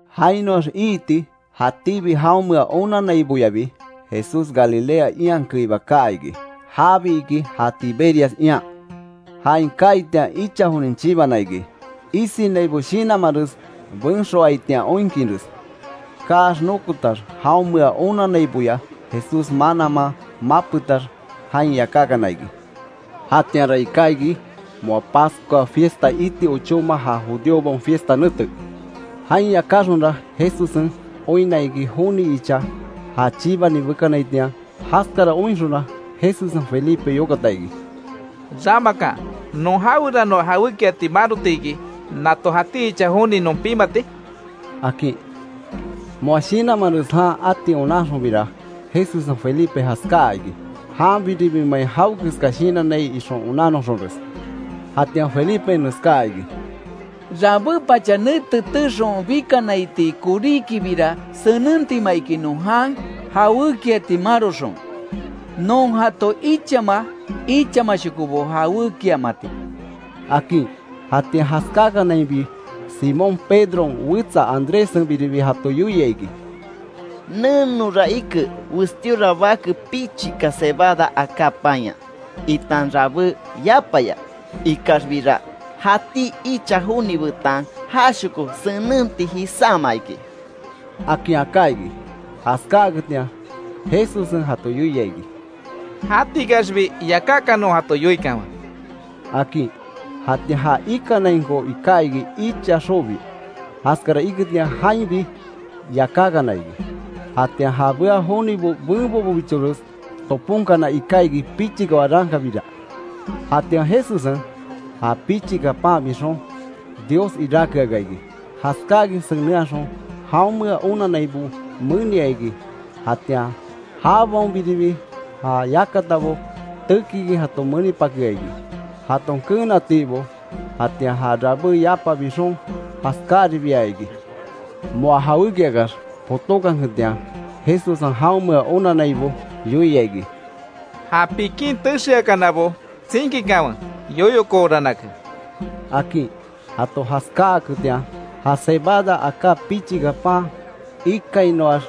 Jainoax iiti jatíbi jaonmea onanaiboyabi Jesús Galilea ian keiba kaa iki. Jabi iki ja Tiberias ian. Jain kaaitian icha jonin chibana iki isinaibo shinanmares benxoaitian oinkinres. Kaax nokotax jaonmea onannaiboya Jesús mananman mapetax, jain yakákana iki. Jatianra iká iki moa Pascua fiesta iti ochóma; ja judíobaon fiesta nete. Jain yakáxonra, Jesussen oinna iki joni icha ja chibani bekanaitian. Jaskara oinxonra Jesussen Felipe yokata iki: —¿Ramakan non jaweranoa jawékiati marotiki nato jati icha joni non pimati? —akin. Moa shinanmanres jan ati onanxonbira Jesussen Felipe jaskáa iki. Janbiribimein jawekeska shinannai ixon onannoxonres. Jatian Felipen neskaa iki: —Rabé pacha nete teexon bikanaitii koríkibira senentima iki non jan jawékiati maroxon, non jato ichama ichamashokobo jawékiamati —akin. Jatian jaskakanainbi Simón Pedron wetsa Andréssenbiribi jato yoia iki: —Nenora ike westíora bake pichika cebada aká panya, itan rabé yapaya. Ikaxbira, jatí icha joni betan jashoko senenti jisáma iki —akin aká iki. Jaskáaketian Jesussen jato yoia iki: —Jatikaxbi yakákanon jato yoikanwe —akin. Jatian ja ikanainko iká iki icha xobi, jaskara iketian jainbi yakákana iki. Jatian ja bea jonibo benbobobichores toponkana ika iki pichika warankabira. Jatian Jesussen, ja pichika pan bixon, Dios iráke aka iki. Jaskáakin senenhaxon, jaonmea onannaibo menia iki. Jatian jabaonbiribi ja yakatabo tekikin jato menipakea iki, jaton keenatiibo. Jatian ja rabé yapa bixon jaskáaribia iki. Moa jawékiax potókanketian, Jesussen jaonmea onannaibo yoia iki: —Ja pikin texeakanabo tsinkikanwe yoyokooranake —akin. Jato jaskáaketian ja cebada aká pichika pan ikainoax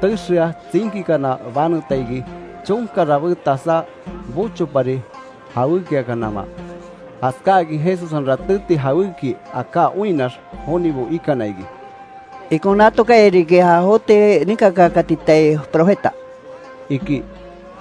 texea tsinkikana baneta iki, chonka rabé tasá bochopari jawékiakanama. Jaskáakin Jesussen ratéti jawéki aká oinnax jonibo ikana iki: —Ikon natokaya riki ja joti ninkakaakatitai profeta —iki.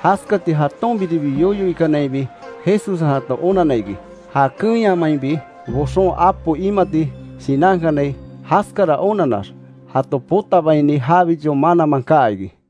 Jaskati jatonbiribi yoyo ikanainbi Jesussen jato onanna iki, ja keenyamainbi boxon apo imati shinankanai. Jaskara onannax, jato potabaini jabicho mananman kaa iki.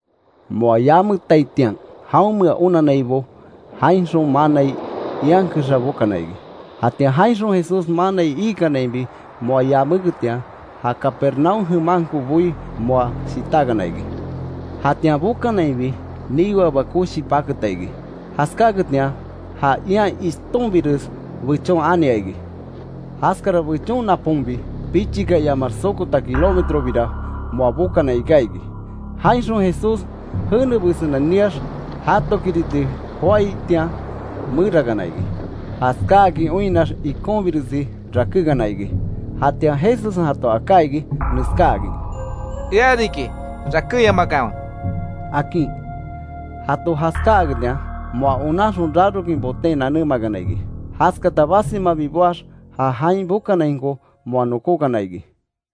Moa yametaitian jaonmea onannaibo, jainxon manai ian kexa bokana iki. Jatian jainxon Jesús manai iikanainbi moa yaméketian, ja Capernaúm jemanko boí moa shitákana iki. Jatian bokanainbi niweaba koshi paketa iki. Jaskaketian ja ian ishtonbires bechon ania iki. Jaskara bechon naponbi, pichika iamax sokota kilómetrobira moa bokana iká iki, jainxon Jesús jene besenen niax jatokiriti joaitian merakana iki, jaskáakin oinnax ikonbiresi rakékana iki. Jatian Jesussen jato aká iki, neskáakin: —¡Ea riki, rakéyamakanwe! —akin. Jato jaskáaketian, moa onanxon rarokin, boten nanémakana iki, jaskata basimabi boax, ja jain bokanainko moa nokókana iki.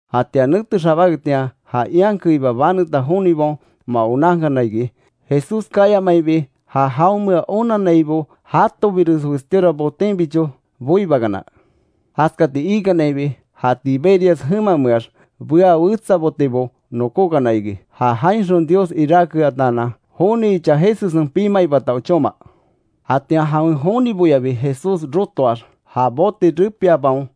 Jatian nete xabáketian, ja ian keiba baneta jonibaon moa onankana iki, Jesús kayamaibi ja jaonmea onannaibo jatobires westíora botenbicho boibakana. Jaskati iikanainbi, ja Tiberias jemameax bea wetsa botebo nokókana iki, ja jainxon Dios iráke ataanan joni icha Jesussen pimaibata ochóma. Jatian jawen joniboyabi Jesús rotoax, ja bote repiabaon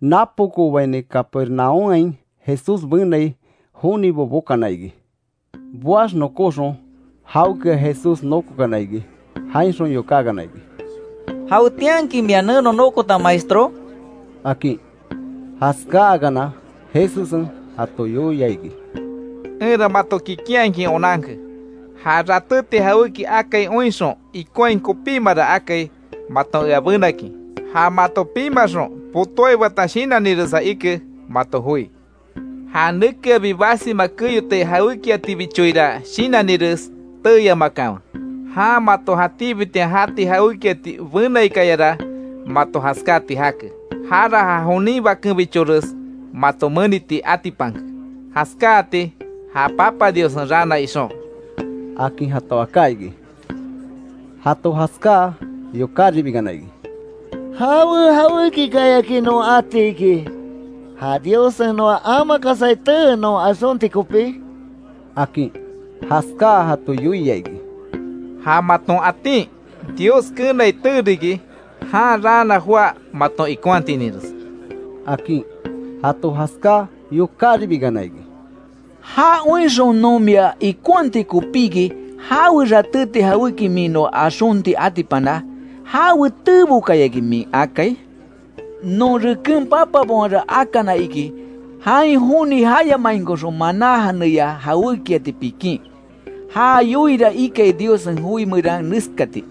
napokoobaini Capermaúmhain Jesús benai, jonibo bokana iki. Boax nokóxon jaokea Jesús nokokana iki. Jainxon yokákana iki: —¿Jawetianki mia neno nokota Maestró? —akin. Jaskáakana Jesussen jato yoia iki: —Enra mato kikinhakin onanke, ja ratéti jawéki akai oinxon ikonhai kopímara akai maton ea benakin, ja mato pimaxon potóaibata shinanniresa ike mato joi. Ja nekeabi basima keyotai jawékiatibichoira shinannires teeyamakanwe, jan mato jatíbitian jati jawékiati benaikayara mato jaskáti jake; jara ja jonin Bakenbichores mato meniti atipanke, jaskáati ja Papa Diossen raana ixon —akin jato aká iki. Jato jaskáa yokáribikana iki: —¿Jawe jawékikayaki non ati iki, ja Diossen noa amakasai tee non axonti kopí? —akin. Jaskáa jato yoia iki: —Ja maton atin Dios keenai tee riki, jan raana joá maton ikonhatininres —akin. Jato jaskáa, yokáribikana iki: —Ja oinxon non mia ikonhati kopíki ¿Jawe ratéti jawéki min noa axonti atipana? ¿Jawe teebokayaki min akai? Non reken papabaonra akana iki, jain joni jayamainkoxon maná janeya jawékiati pikin. Ja yoiira ikai Diossen joi meran neskati: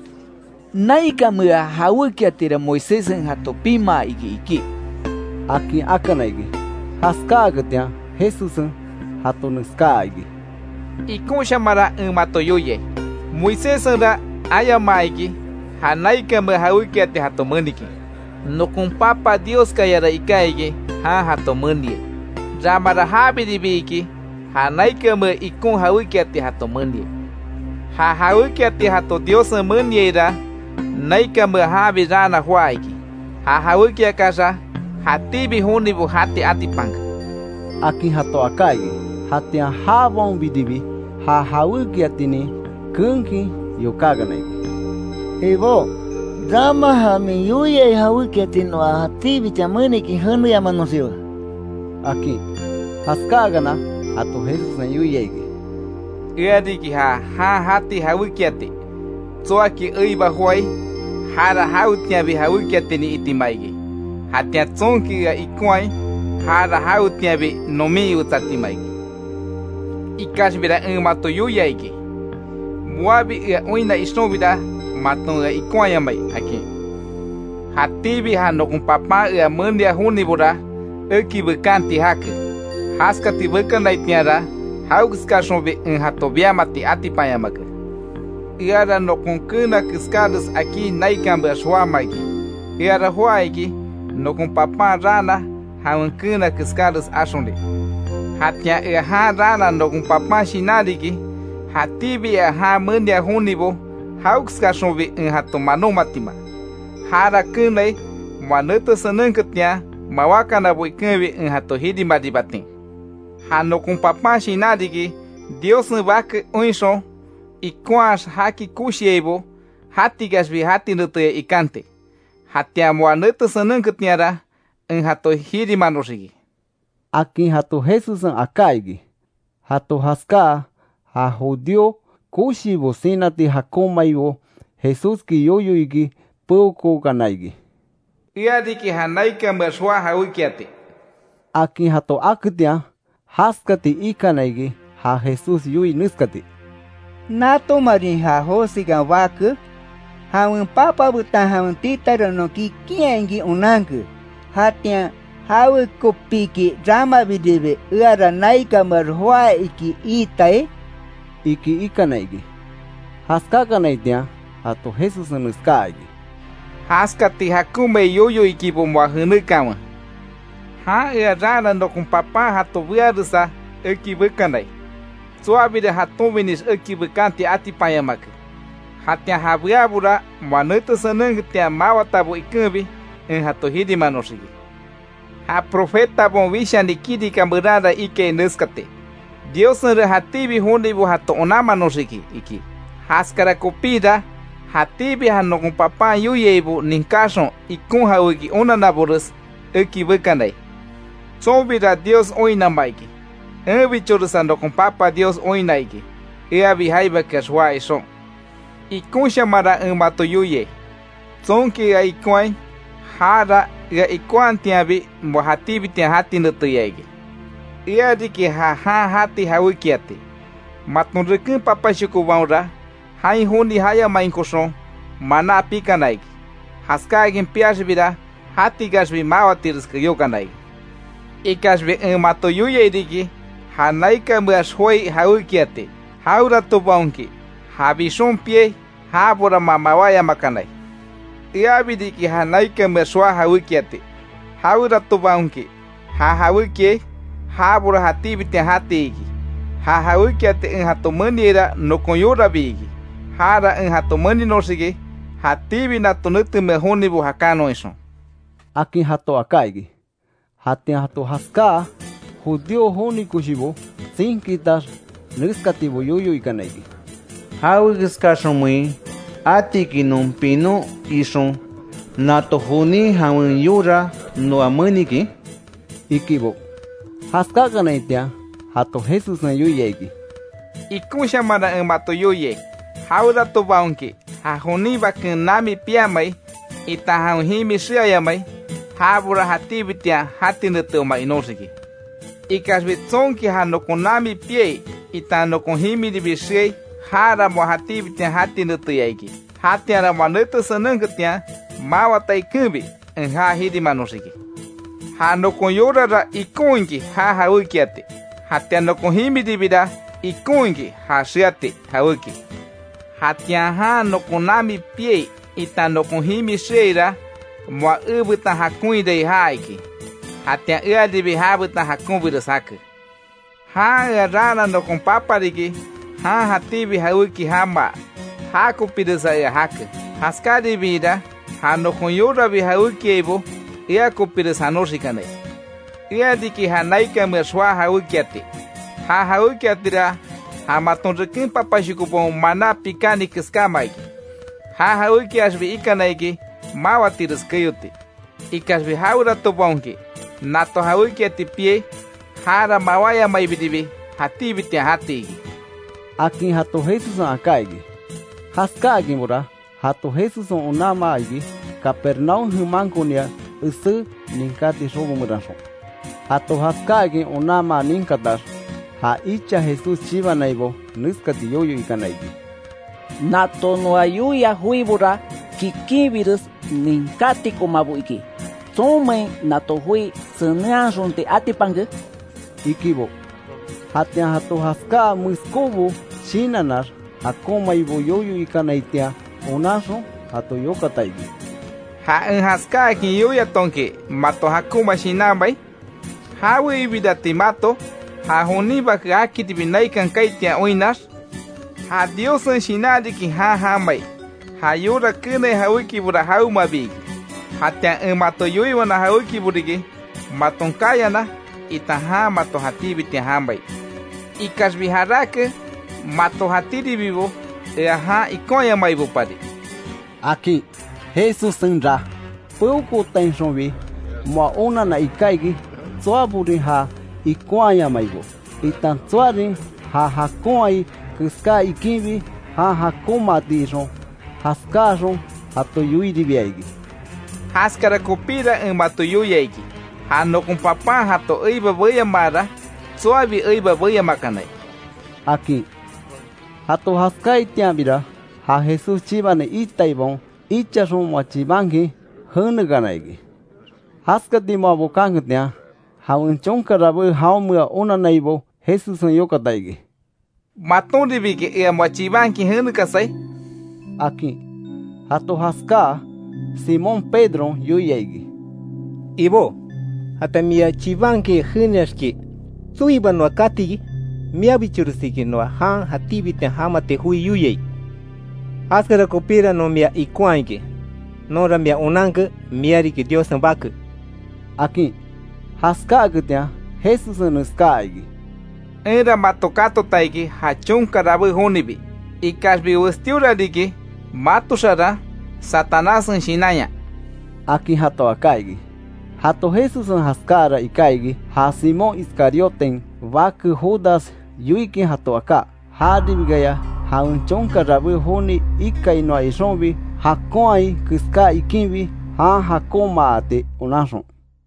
‘Naikamea jawékiatira Moiséssen jato pimaa iki’, iki —akin akana iki. Jaskáakanketian Jesussen jato neskaa iki: —Ikonshamanra en mato yoiai, Moiséssenra ayamaa iki, ja naikanmea jawékiati jato menikin. Nokon Papa Dioskayara iká iki, jan jato meniai. Ramara jabiribi iki, ja naikanmea ikon jawékiati jato meniai. Ja jawékiati jato Diossen meniaira, naikanmea janbi raana joá iki, ja jawékiaxa jatíbi jonibo jati atipanke —akin jato aká iki. Jatian jabaonbiribi ja jawékiatinin keenkin yokákana iki: —Ibó, rama ja min yoia jawékiati noa jatíbitian menikin jeneyamanoxiwe —akin. Jaskáakana, jato Jesussen yoia iki: —Ea riki ja jan jati jawékiati, tsoaki eiba joái, jara jawetianbi jawékiatinin itima iki; jatian tsonki ea ikonhai, jara jawetianbi nomin iwetsatima iki. Ikaxbira en mato yoia iki; moabi ea oinna ixonbira maton ikonhayamai akin. Jatíbi ja nokon Papan ea menia jonibora, eki bekanti jake, jaskati bekanaitianra jawekeskaxonbi en jato biamati atipanyamake. Eara nokon keena keskáres akí naikanmeax joáma iki. Eara joá iki nokon Papan raana, jawen keena keskáres axoni. Jatian ea jan raana nokon Papan shinan riki, jatíbi ea jan menia jonibo, jawekeskaxonbi en jato manómatima; jara keenai moa nete senenketian, mawákanabo ikenbi en jato jirimaribatin. Ja nokon Papan shinan riki, Diossen bake oinxon, ikonhaax jaki koshiaibo, jatikaxbi jati neteya ikanti; jatian moa nete senenketianra en jato jirimanoxiki —akin jato Jesussen aká iki. Jato jaskáa, ja judío koshibo sinati jakonmaibo Jesúski yoyo iki peokookana iki: “Ea riki ja naikanmeax joá jawékiati”, akin jato aketian. Jaskati ikana iki ja Jesús yoii neskati: —¿Natomarin ja Josekan bake? Jawen papa betan jawen titara non kikinhakin onanke. Jatian ¿Jawekopíki ramabiribi, eara naikanmeax joá iki iitai? —iki ikana iki. Jaskakanaitian jato Jesussen neskaa iki: —Jaskati jakonmai yoyo ikibo moa jenekanwe. Jan ea raana nokon Papan jato bearesa eki bekanai, tsoabira jatonbinix eki bekanti atipanyamake. Jatian ja beabora, moa nete senenketian, mawatabo ikenbi en jato jirimanoxiki. Ja profetabaon wishani kirika meranra ikai neskati: ‘Diossenra jatíbi jonibo jato onanmanoxiki’, iki. Jaskara kopíra jatíbi ja nokon Papan yoiaibo ninkaxon ikon jawéki onannabores, eki bekanai. Tsonbira Dios oinnama iki; enbichoresa nokon Papa Dios oinna iki, eabi jaibakex joá ixon. Ikonshamanra en mato yoiai, tsonki ea ikonhaai, jara ea ikonhatianbi, moa jatíbitian jati neteya iki. Ea riki ja jan jati jawékiati. Maton reken papashokobaonra, jain joni jayamainkoxon maná pikana iki, jaskáakin piaxbira, jatikaxbi máwatires keyókana iki. Ikaxbi en mato yoiai riki, ja naikanmeax joái jawékiati; jaweratobaonki ja bixon piai, jabora moa mawáyamakanai. Eabi riki ja naikanmeax joá jawékiati. Jaweratobaonki ja jawékiai, jabora jatíbitian jati iki. Ja jawékiati en jato meniaira nokon yorabi iki. Jara en jato meninoxiki, jatíbi nato netemea jonibo jakanon ixon —akin jato aká iki. Jatian jato jaskáa, judío joni koshibo tsinkitax neskatibo yoyo ikana iki: —¿Jawekeskaxonmein atiki non pinon ixon nato jonin jawen yora noa menikin? —ikibo. Jaskakanaitian jato Jesussen yoia iki: —Ikonshamanra en mato yoiai, jaweratobaonki ja jonin Baken nami piamai, itan jawen jimi xeayamai, jabora jatíbitian jati neteoma inóxiki. Ikaxbi tsonki ja nokon nami piai itan nokon jimiribi xeai, jara moa jatíbitian jati neteya iki; jatianra moa nete senenketian, mawata ikenbi en ja jirimanoxiki. Ja nokon yorara ikon iki ja jawékiati, jatian nokon jimiribira ikon iki ja xeati jawéki. Jatian jan nokon nami piai itan nokon jimi xeaira, moa ebetan jakonhirai já iki, jatian earibi jabetan jakonbires jake. Jan ea raana nokon Papa riki jan jatíbi jawéki jamaa, jakopiresa ea jake. Jaskaribiira ja nokon yorabi jawékiaibo, ea kopires janoxikanai. Ea riki ja naikanmeax joá jawékiati, ja jawékiatira ja maton reken papashokobaon maná pikani keskáma iki, ja jawékiaxbi ikana iki máwatires keyoti; ikaxbi jaweratobaonki nato jawékiati piai, jara mawáyamaibiribi jatíbitian jati iki —akin jato Jesussen aká iki. Jaskáakinbora jato Jesussen onanmaa iki Capermaúm jemankonia esé ninkati xobo meranxon. Jato jaskáakin onanmaa ninkatax, ja icha Jesús chibanaibo neskati yoyo ikana iki: —Nato noa yoiai joibora, kikinbires ninkátikomabo iki ¿Tsonmein nato joi senenhaxonti atipanke? —ikibo. Jatian jato jaskáa, meskóbo shinannax jakonmaibo yoyo ikanaitian onanxon, jato yokata iki: —¿Ja en jaskáakin yoiatonki mato jakonma shinanmai? ¿Jawe ibirati mato, ja jonin Bake jakiribi naikan kaaitian oinnax? Ja Diossen Shinan riki jan jamai; ja yora keenai jawékibora jawemabi iki. Jatian en mato yoiwana jawékibo riki maton kayana itan jan mato jatíbitian jamai. Ikaxbi jarake mato jatíribibo ea jan ikonhayamaibopari —akin. Jesussenra peokootainxonbi moa onanna iká iki, tsoaborin jan ikonhayamaibo, itan tsoarin já jakonhai keská iikinbi, jan jakonmaati ixon. Jaskáaxon jato yoiribia iki: —Jaskara kopíra en mato yoia iki, ja nokon Papan jato eiba beyamaara tsoabi eiba beyamakanai —akin. Jato jaskáatianbira ja Jesús chibani iitaibaon, ichaxon moa chibankin jenekana iki. Jaskati moa bokanketian, jawen chonka rabé jaonmea onannaibo, Jesussen yokata iki: —¿Matonribiki ea moa chibankin jenekasai? —akin. Jato jaskáa, Simón Pedron yoia iki: —Ibó, jatian mia chibankin jeneaxki ¿Tsoiba noa kati iki? Miabichoresiki noa jan jatíbitian jamati joi yoiai. Jaskara kopíra non mia ikonhaa iki, nonra mia onanke, mia riki Diossen Bake —akin. Jaskáaketian Jesussen neskaa iki: —Enra mato katota iki ja chonka rabé jonibi. Ikaxbi westíora riki mato xaran Satanássen shinanya —akin jato aká iki. Jato Jesussen jaskáara iká iki, ja Simón Iscariotin bake Judas yoikin jato aká, jaribikaya jawen chonka rabé joni ikainoa ixonbi, jakonhai keská iikinbi, jan jakonmaati onanxon.